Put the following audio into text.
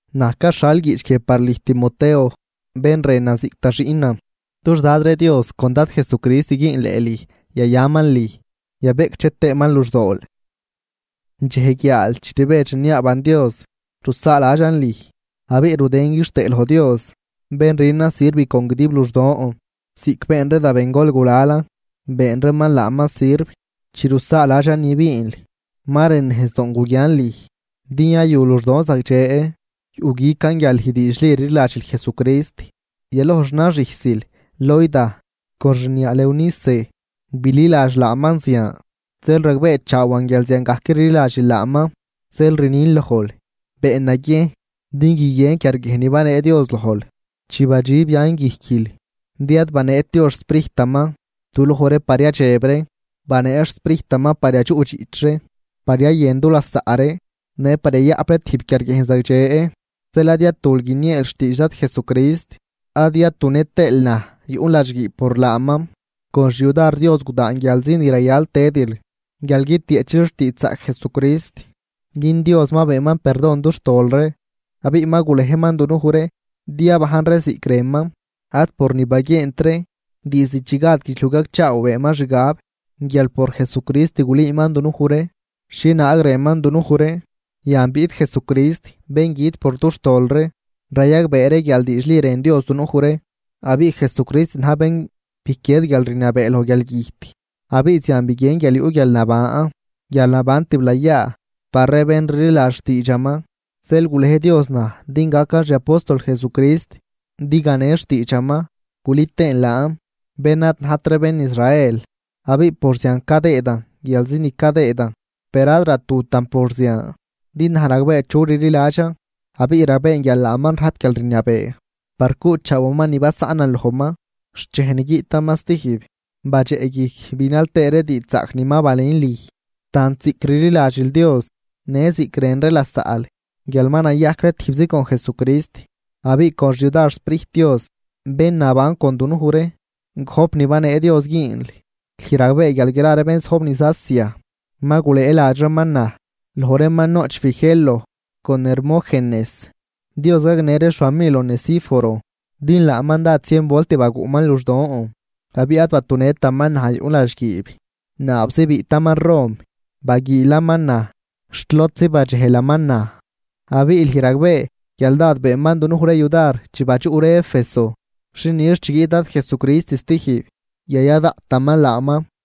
Naj caxhal guiꞌch guie par lüj Timoteo bén rënan ziꞌc da xiꞌnan. Dux Dad ree Dios con Dad Jesucrist güünleꞌ lüj, yayaman lüj, yabeꞌcdxe tëëman luxdool. Dxej guiaal chi rbedx rniaaban Dios, rusaaladxan lüj, abiꞌ rudën quixtëë loj Dios, bén rünan sirv con guidib luxdon ziꞌc been ree da bengol gulalan been reeman laaman sirv. Chi rusaaladxan ni biinl, ma rën nejzdoon guguian lüj din yayu luxdon zagdxe. Yuꞌguican guial lüj diidxli rliladxil Jesucrist, yaloj xnaxüjsil Loida con xniaal Eunice bililadx laaman zian, zeel ragbeechaawan guial ziangajc rliladxil laaman. Zeel rnin lojl, been naguiejn din guiguien quiarguiejn ni banee Dios lojl chi badxib yan guijquil. Din ad baneet Dios xSprijtaman duloj ree par yadxeb ree, banee xSprijtaman par yadxuꞌdxiꞌch ree, par yayën du lasaꞌ ree, në par yayaꞌp ree tijb quiarguiejn zagdxe. Zeel ad yatul guinieel xtiidx Dad Jesucrist, ad yatu nëtëël naj yuꞌn ladxguiib por laaman, con xyudar Dios gudaan guialzi ni rayal tëdil guial guitieꞌchil xtiidxzaꞌc Jesucrist. Din Dios ma beenman perdon dux tol ree abiꞌ ma gulejman dunuj ree din yabajn ree ziꞌc rënman, ad por ni baguient ree, diizd chi gad guidxliuj gacchaaw beenman xgab guial por Jesucrist gulüüman dunuj ree xhienaag rënman dunuj ree. Yan biꞌt Jesucrist bén güt por dux tol ree, rayagbee ree guial diidxli rën Dios dunuj ree. Abiꞌ Jesucrist na̱j bén biquied guialrniabee loj guialgüjt abiꞌ zian biguien guial yuꞌ guialnaban, guialnaban tiblayaa par ree bén rliladx xtiidxaman. Zeel gulej Dios naj din gacan xi apóstol Jesucrist, din ganen xtiidxaman gulü tëën laan bén ad najt ree bén Israel, abiꞌ por zian cadëëdan guialzi ni cadëëdan. Per ad ratutan por zian, din naj ragbee chu rliladxan, abiꞌ ragbeen guial laaman rajp guialrniabee par cuꞌchaawaman ni basaꞌnan lojman xt dxej ni guiꞌtaman stijb. Badxeꞌguijc binal tëë ree diidxzaꞌc ni ma balün lüj, tant ziꞌc rliladxil Dios në ziꞌc rën ree lasaꞌl guial ma nayajc ree tijbzi con Jesucrist. Abiꞌ con xyudar xSprijt Dios bén naban con dunuj ree, gojp ni banee Dios güünl. Lüj ragbee guial gra ree bén zojb niz Asia ma gulëëladx reeman naj, loj reeman noꞌch Figelo con Hermógenes. Dios gagnë ree xfamil Onesíforo, din laaman dád zien volt baguꞌman luxdon. Abiꞌ ad batunëtaman naj yuꞌn ladxguiib, naabzi biꞌtaman Rom baguiilaman naj xt lodzi badxejlaman naj. Abiꞌ lüj ragbee guial dád beenman dunuj ree yudar chi badxuꞌ ree Éfeso. Xi nix chi guiꞌt Dad Jesucrist stijb, yaya daꞌtaman laaman.